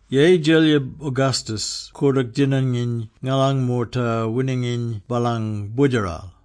Yeyi Djelyib Augustus koordook djinanginy ngalan moorta wininginy baalang boodjeral.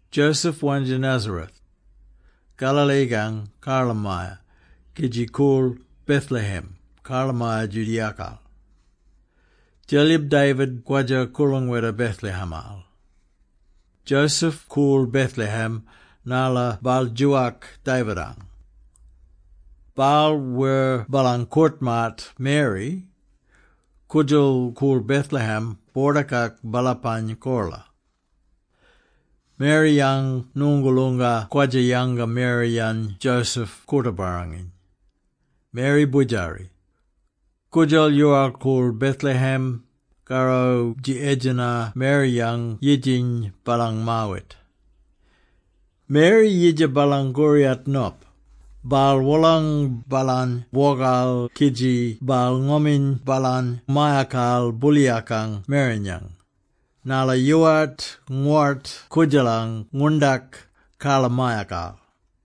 Joseph wandja Nazareth, Galilee-kang karlamaya, kidji koorl Bethlehem, karlamaya Judea-kal. Djelyib David kwadja-koorlangweta Bethlehem-al. Joseph koorl Bethlehem narla baal djoowak David-ang. Baal wer baalang koort-maat Mary, koodjal koorl Bethlehem boordakak baalapang kola. Mary-yang ngoongoolonga kwadja-yanga Mary-yany Joseph koorta-barranginy. Mary boodjari. Koodjal yoowal-koorl Bethlehem, karro dji edjena Mary-yang yidjiny baalang maawit. Mary yidja baalang koriyat nop, baal wolang baalany bwokal kidji baal ngoming baalany mayakal booliyakang merenyang, narla yoowart ngowort koodjalang ngwoorndak karlamayakal.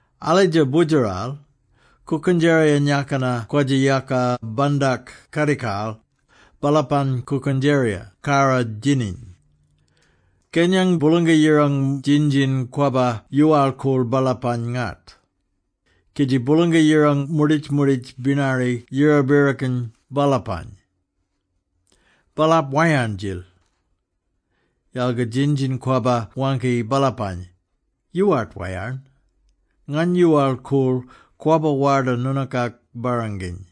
Alitja boodjeral, kookendjeriyang-yakina kwadja-yaka bandak kadikal, baalapang kookendjerira karrodjininy. Kenyang Boolanga-Yirang djin-djin-kwabba yoowal-koorl baalapany-ngat, kidji Boolanga-Yirang moorditj-moorditj binari yira-birrikon baalapany. Baalap wayarn-djil. Yalga djin-djin-kwabba waangki baalapany, “Yoowart wayarn! Ngany yoowal-koorl, kwabba warda noonookak barranginy.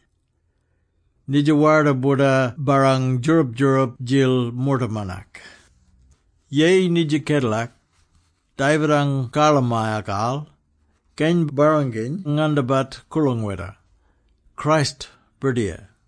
Nidja warda boorda barrang djoorab-djoorab-djil moortamanak! “Yeyi nidja kedela, David-ang karlamayakal, Keny-Barranginy-Ngandabat koorlangweta - Christ Birdiyar!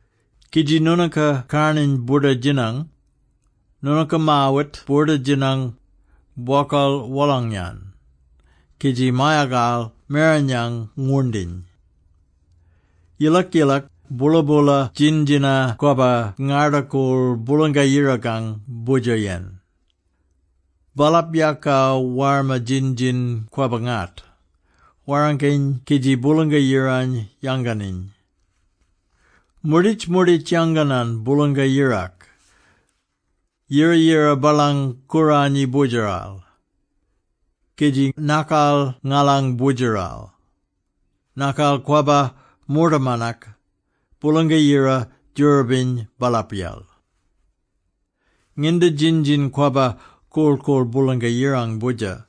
Kidji noonooka karnarny boorda-djinang: noonooka maawit boorda-djinang, bwokal wolang-yan, kidji mayakal merenyang ngwoorndiny.” Yilak-yilak, boola-boola djin-djina-kwabba ngarda-koorl Boolanga-Yirakang Boodjer-yen. Baalap yaaka warma djin-djin-kwabba-ngat, warrangkiny kidji Boolanga-Yirany yanganiny. “Moorditj-moorditj yanganan Boolanga-Yirak, yira-yira baalang Kooranyi Boodjeral, kidji nakal ngalang Boodjeral. Nakal kwabba moortamanak. Boolanga-Yira djoorabiny baalapyel.” Nginda djin-djina-kwabba korl-koorl Boolanga-Yirang Boodjer,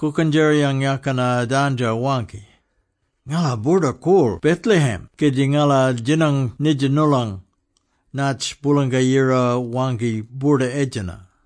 kookendjeriyang-yakina dandjo-waangki, “Ngala boorda-koorl Bethlehem kidji ngala djinang nidja noolong, naatj Boolanga-Yira waangki boorda-edjena.”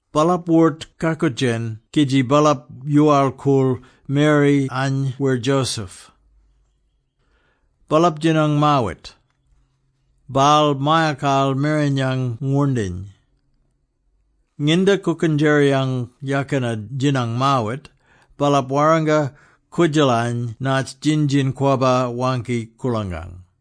Baalap wort-kakoodjen kidji baalap yoowal-koorl Mary-any wer Joseph. Baalap djinang maawit. Baal mayakal merenyang ngwoorndiny. Nginda kookendjeriyang-yakina djinang maawit, baalap warranga koodjalany natj djin-djin-kwabba waangki koorlangang.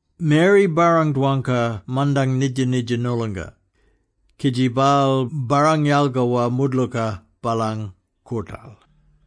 Mary barrang-dwangka mandang nidja-nidja noolonga, kidji baal barrang-yalgawa moodlooka baalang koortal.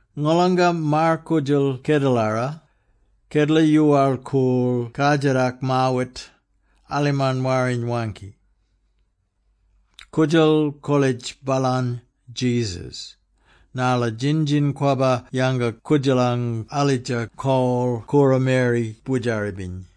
Ngolanga maar-koodjal kedelara, kedela yoowal-koorl kardjatak maawit, alimarn Warriny waangki. Koodjal kolitj baalany ‘Jesus’, narla djin-djin-kwabba yanga koodjalany alitja kol koora Mary boodjari-biny.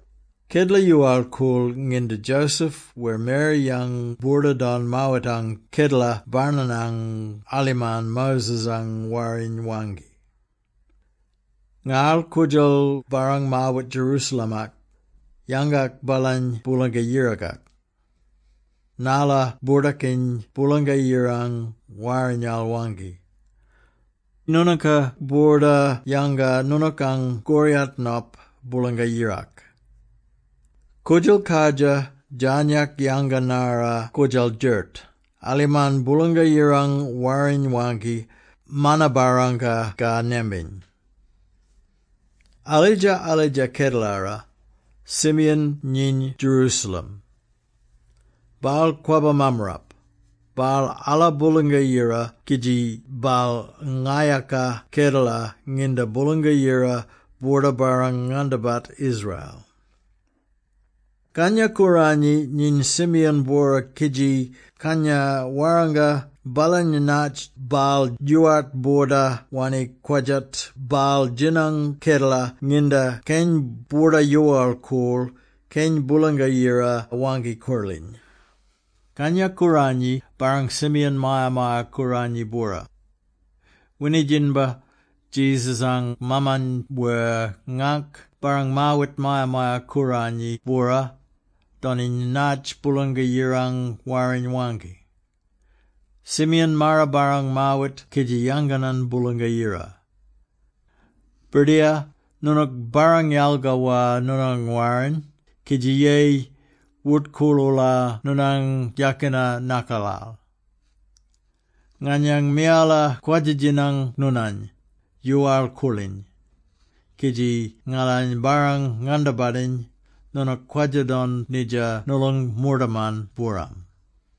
Kedela yoowal-koorl nginda Joseph wer Mary-yang boorda-don maawitang Kedela Barnanang alimarn Moses-ang Warriny waangki. Ngarl koodjal barrang maawit Jerusalem-ak, yangak baalany Boolanga-Yirakak, narla boordakiny Boolanga-Yirang Warrinyal waangki, “Noonooka boorda yanga noonookang koryat nop Boolanga-Yirak.” Koodjal kardjir djarnyak yanga-narra koodjal djert, alimarn Boolanga-Yirang Warriny waangki, mana-barangka ka nembing. Alidja-alidja kedalara, Simeon nyiny Jerusalem. Baal kwabba mammarap. Baal ala Boolanga-Yira kidji baal ngayaka kedela nginda Boolanga-Yira boorda barrang-ngandabat Israel. Kangya-Kooranyi nyiny Simeon-bwora kidji Kangya warranga baalany natj baal yoowart boorda wanni kwadjat baal djinang kedela nginda Keny boorda-yoowal-koorl, Keny Boolanga-Yira Waangki-Koorliny. Kangya-Kooranyi barrang Simeon Maya-maya-Kooranyi-bwora. Winidjinbar, Jesus-ang maaman wer ngaangk barrang maawit Maya-maya-Kooranyi bwora, doniny natj Boolanga-Yirang Warriny waangki. Simeon maara-barrang maawit kidji yanganan Boolanga-Yira. “Birdiyar, noonook barrang-yalgawa noonang warrin, kidji yeyi, wort-koorl-oola noonang yakina nakalal. Nganyang miyala kwadja-djinang noonany, yoowal-koorliny kidji ngalany barrang-ngandabatiny Noonook kwadja-don nidja noolong moortaman booram: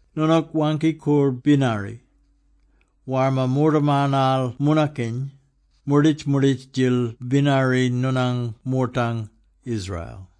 Noonook waangki-koorl binari, warma moortamanal moonakiny; moorditj-moorditj-djil binari noonang moortang, Israel.”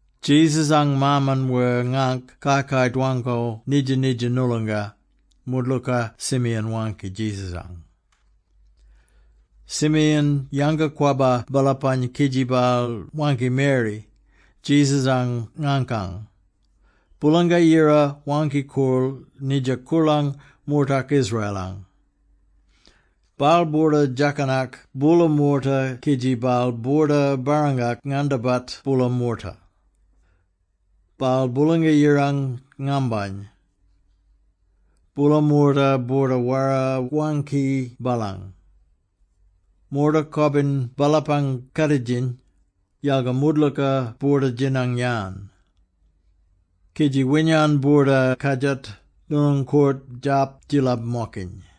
Jesus-ang maaman wer ngaangk kai-kai dwangko nidja-nidja noolonga, moodlooka Simeon waangki Jesus-ang. Simeon yanga-kwabba baalapany kidji baal waangki Mary, Jesus-ang ngaangkany, “Boolanga-Yira waangki-koorl nidja koorlang moortak Israel-ang. Baal boorda djakanak boola moorta kidji baal boorda barrangak-ngandabat boola moorta. Baal Boolanga-Yirang ngambany. Boola moorta boorda wara-waangki baalany. Moorta kobin baalapang kaaditjiny, yalga moodlooka boorda-djinang-yan. Kidji winyan boorda-kardjat noonang koort djarp djillab-mokiny.”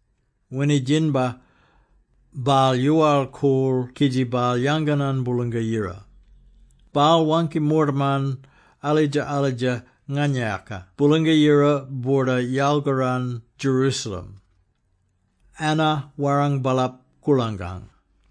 Winidjinbar, baal yoowal-koorl kidji baal yanganan Boolanga-Yira. Baal waangki moortaman, alidja-alidja nganayaka Boolanga-Yira boorda yalkaran Jerusalem. Anna warrang baalap koorlangang.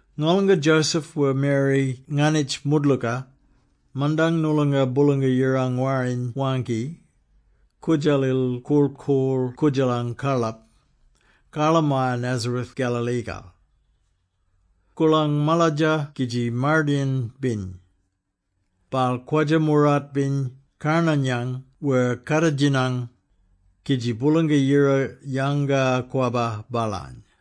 Ngolanga Joseph wer Mary nganitj moodlooka, mandang noolonga Boolanga-Yirang Warriny waangki, koodjalil korl-koorl koodjalang karlap, karlamaya Nazareth Galilee-kal. Koorlang maladja kidji mardayin-biny; baal kwadja moorart-biny karnarnyang wer kaaditjinyang, kidji Boolanga-Yira yanga-kwabba baalany.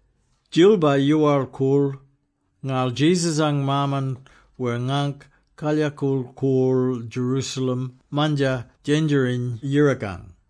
Djilba yoowal-koorl, ngarl Jesus-ang maaman wer ngaangk kalyakool koorl Jerusalem Mandjar Djendjeriny-Yirakang.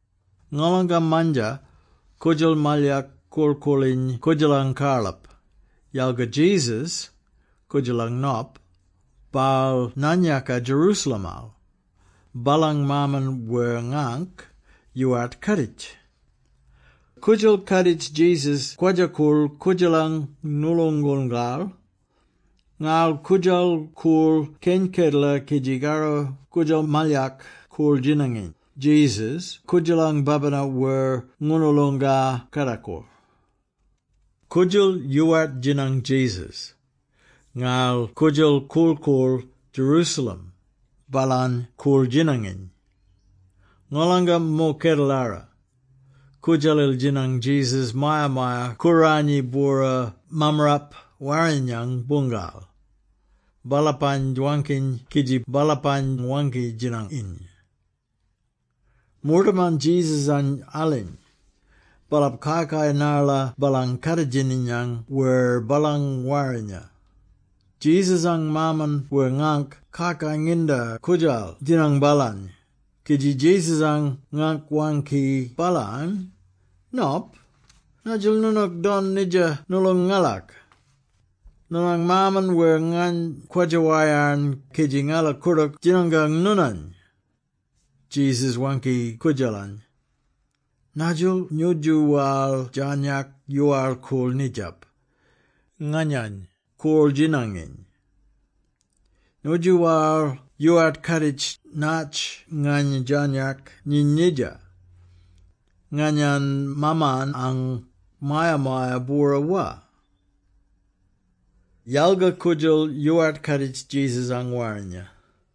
Ngolanga Mandjar, koodjal malyak korl-koorliny koodjalang karlap, yalga Jesus, koodjalang nop, baal naan-yaaka Jerusalem-al. Baalang maaman wer ngaangk yoowart kaaditj. Koodjal kaaditj Jesus kwadja-koorl koodjalang ngooloongongal, ngarl koodjal koorl keny kedela kidji karro koodjal malyak koorl-djinanginy Jesus koodjalang babina wer ngoonoolonga kardakor. Koodjal yoowart djinang Jesus, ngarl koodjal korl-koorl Jerusalem, baalany koorl-djinanginy. Ngolanga mo kedelara, koodjalil djinang Jesus Maya-maya-Kooranyi-bwora Mammarap Warrinyang-boongal, baalapany dwangkiny kidji baalapany waangki-djinanginy. Moortaman Jesus-any aliny, baalap kai-kai narla baalang kaaditjinyang wer baalang warrinya. Jesus-ang maaman wer ngaangk kai-kai nginda koodjal djinang baalany, kidji Jesus-ang ngaangk waangki baalany, “Nop, nadjil noonook don nidja noolong ngalak? Noonang maaman wer ngany kwadja-wayarn kidji ngala koordook djinango noonany.” Jesus waangki koodjalany, “Nadjil nyoodjoowal djarnyak yoowal-koorl nidjap, nganyany korl-djinanginy? Nyoodjoowal yoowart kaaditj natj ngany djarnyak nyiny nidja, nganyang Maamanang Maya-maya-bwora, wa?” Yalga koodjal yoowart kaaditj Jesus-ang warrinya.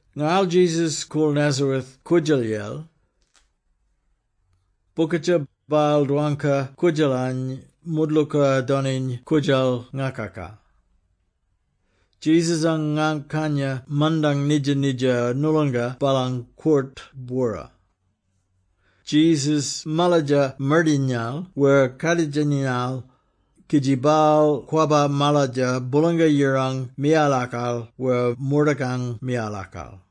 Ngarl Jesus koorl Nazareth koodjalyel. Bokadja, baal dwangka koodjalany, moodlooka doniny koodjal ngakaka. Jesus-ang ngaank kanya mandang nidja-nidja noolonga baalang koort-bwora. Jesus maladja mardayinal wer kaadjitinyal, kidji baal kwabba maladja Boolanga-Yirang miyalakal wer moortakang miyalakal.